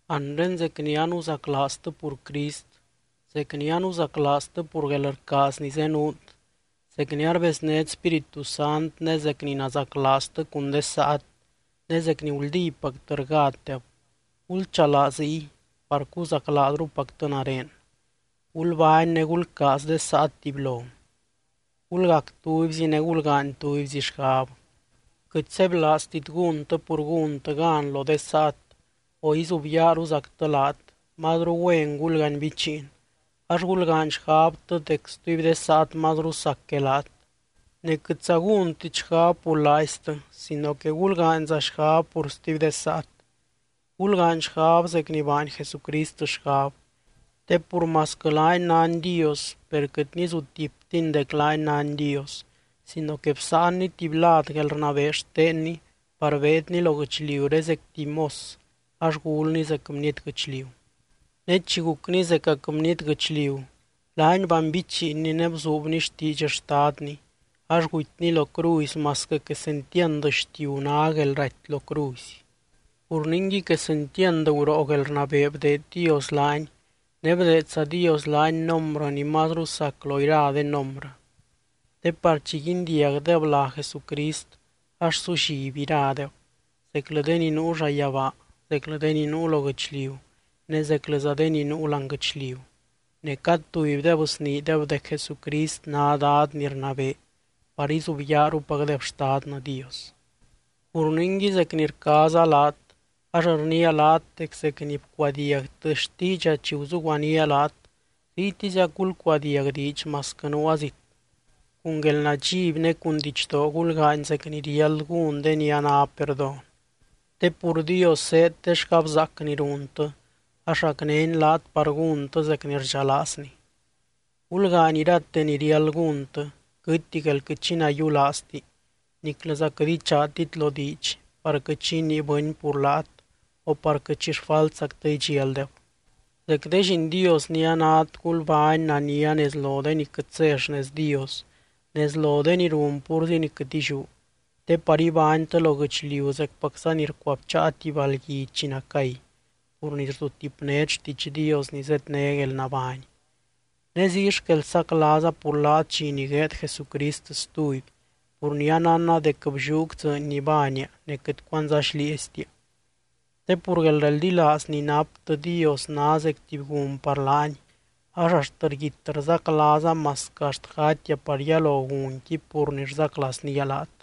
Anre zec ni anuzaclaaztɨ pur Crist, zec ni anuzaclaaztɨ pur guelrcaaz ni zenuut, zec ni arbeznét Spíritu Sant ne zec ni nazaclaaztɨ cun de saat ne zec ni guldípactɨ rgátdeb, gulchalaa ziy par cuzaclaazrupactɨ nare. Gulbány ne gulcaaz de saat tubylo. Gulgac tubyzi ne gulgaany tubyzi xgab. Quɨt sebylaaztit gúntɨ pur gúntɨ gan lo de saat o izubyaaruzactɨ laat, mazru güen gulganbichiin ax gulgaany xgabtɨ dec stuby de saat mazru sac que laat. Ne quɨtza gúntit xgab pur laaiztɨ sino que gulgaanyza xgab pur stuby de saat. Gulgaany xgab zec ni baany Jesucrist xgab. Te pur masquɨ laany nány Dios per quɨt nizutiptiny dec laany nány Dios sino que bsáanny tuby lad guelrnabee xtenny par beedny lo guɨchliuré zec tuby mos ax gulny zec bniety guɨchliu. Ne chi gucny zecac bniety guɨchliu laany banbichiinny ne bzuubny xtiidx Xtadny ax gutyny lo cruzy masquɨ quesentiand xtiu ná guelraty lo cruzy. Pur ningui quesentiand guroo guelrnabee bdeed Dios laany ne bdeedza Dios laany nombrɨ ni mazru sac lo ira de nombrɨ. Te par chi guindiagdeb lá Jesucrist, ax sulliby iradeb, zeclɨ de ni nuu llayabaa, zeclɨ de ni nuu lo guɨchliu ne zeclɨza de ni nuu láani guɨchliu, ne cad tubydeb sniideb dec Jesucrist ná Dad ni rnabee par izubyaarupacdeb Xtadnɨ Dios. Pur ningui zec ni rcaaza laat, ax rniia laat dec zec ni bcuadiagtɨ xtiidxa chi guzuguanía laat ziytiziac gulcuadiag diidx masquɨ nuua zit. Cun guelnadxiby ne cun didxdoo gulgaany zec ni riáld gún de ni a ná perdón. Te pur Dios zéed de xgabzaac ni runtɨ ax racnény laat par gúntɨ zec ni rdxalaazny. Gulgaany irate ni riáld gúntɨ, quɨtti guél quɨt xi nayiulaazti niclɨza quɨt ichaatit lo diidx par quɨt xi inii bɨny pur laat o par quɨt xi xfaltzactɨ idxialdeb. Zec de lliin Dios ni anát gulbány nania nez lo de ni quɨt zé xnez Dios, nez lo de ni run púrzi ni quɨt illiú. Te par ibánytɨ lo guɨchliu zecpacza ni rcuabcháa tuby balgui chi nacay pur ni rzutipnét xtiidx Dios ni zedné guelnabány. Ne ziy xquel saclaaza pur laat dxi ni gueed Jesucrist stuby pur ni anánna dec blliúc dzɨɨny ni baania ne quɨt cuandzá xlieeztia. Te pur guelreldilaaz ni naptɨ Dios ná zec tuby gun par laany ax axt rguit rzaclaaza masquɨ axt gatia par yalo gunqui pur ni rzaclaaznía laat.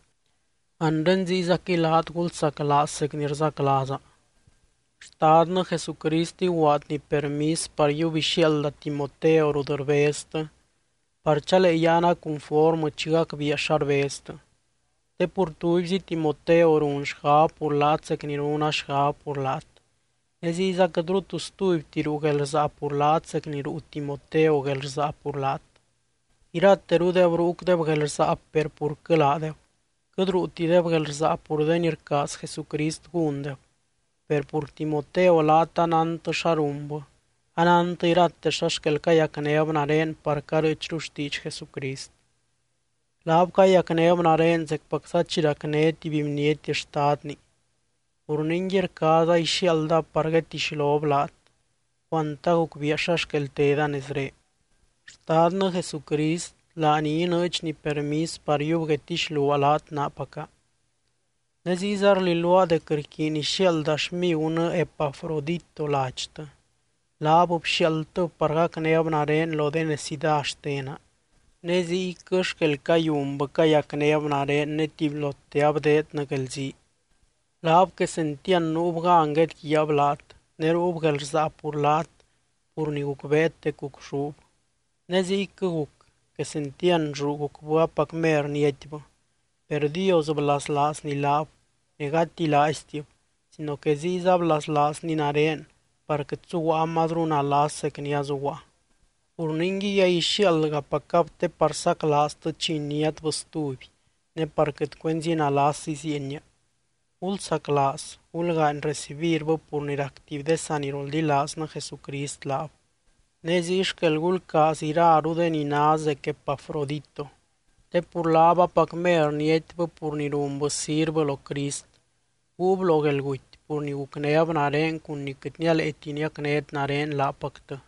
Anre ziyzaquɨy laat gulzaclaaz zec ni rzaclaaza. Xtadnɨ Jesucrist iguaadny permis par yiub ixiaalda Timoteo rut rbeztɨ par chalee yáana cunformɨ chi gacbiia xa rbeztɨ. Te pur tubyzi Timoteo run xgab pur laat zec ni runa xgab pur laat. Ne ziyza quɨtru tu stubyti ruu guelrsaa pur laat zec ni ruu Timoteo guelrsaa pur laat. Iraterudeb ruucdeb guelrsaa per purquɨ laadeb, quɨt ruutideb guelrsaa pur de ni rcaaz Jesucrist gúndeb. Per pur Timoteo laat anántɨ xa runbɨ, anántɨ irate xa xquel cayacnéb nare par carɨɨchru xtiidx Jesucrist. Laab cayacnéb nare zecpacza chi racné tuby bniety xtadni. Pur ningui rcaaza ixiaaldab par guedtixlob laat, cuant agucbiia xa xquel teda nezré. Xtadnɨ Jesucrist laany inɨɨdxny permis par yiub guedtixluaa laat naapaca. Ne ziyza rlilua dec rquiiny ixiaalda xmigunɨ Epafrodito ladxtɨ. Laat bxiaaldtɨb par gacnéb nare lo de necidá xtena. Ne ziyquɨ xquel cayunbɨ cayacnéb nare ne tubylote abdeednɨ guelzii. Laab quesentiand nuub gan guedguiaab laat ne ruub guelrsaa pur laat pur ni gucbeet dec gucxúb. Ne ziyquɨ guc quesentiand lluu gucbɨ apac mer niatybɨ. Per Dios blaslaazny laab ne gati laaiztib sino que ziyza blaslaazny nare par quɨt suguaa mazru nalas zec ni azuguaa. Pur ningui, aixiaaldgapacab te par saclaaztɨ chi iniátbɨ stuby ne par quɨt cuenzi nalas iziienia. Gulsaclaaz gulgaany recibirbɨ pur ni rac tuby de saniroldilaaznɨ Jesucrist laab. Ne ziy xquel gulcaaz iraru de ni ná zec Epafrodito. Te pur laab apac mer niatybɨ pur ni runbɨ sirvɨ lo Crist, guub lo guelguty pur ni gucnéb nare cun ni quɨt nialeeti niacnét nare laapactɨ.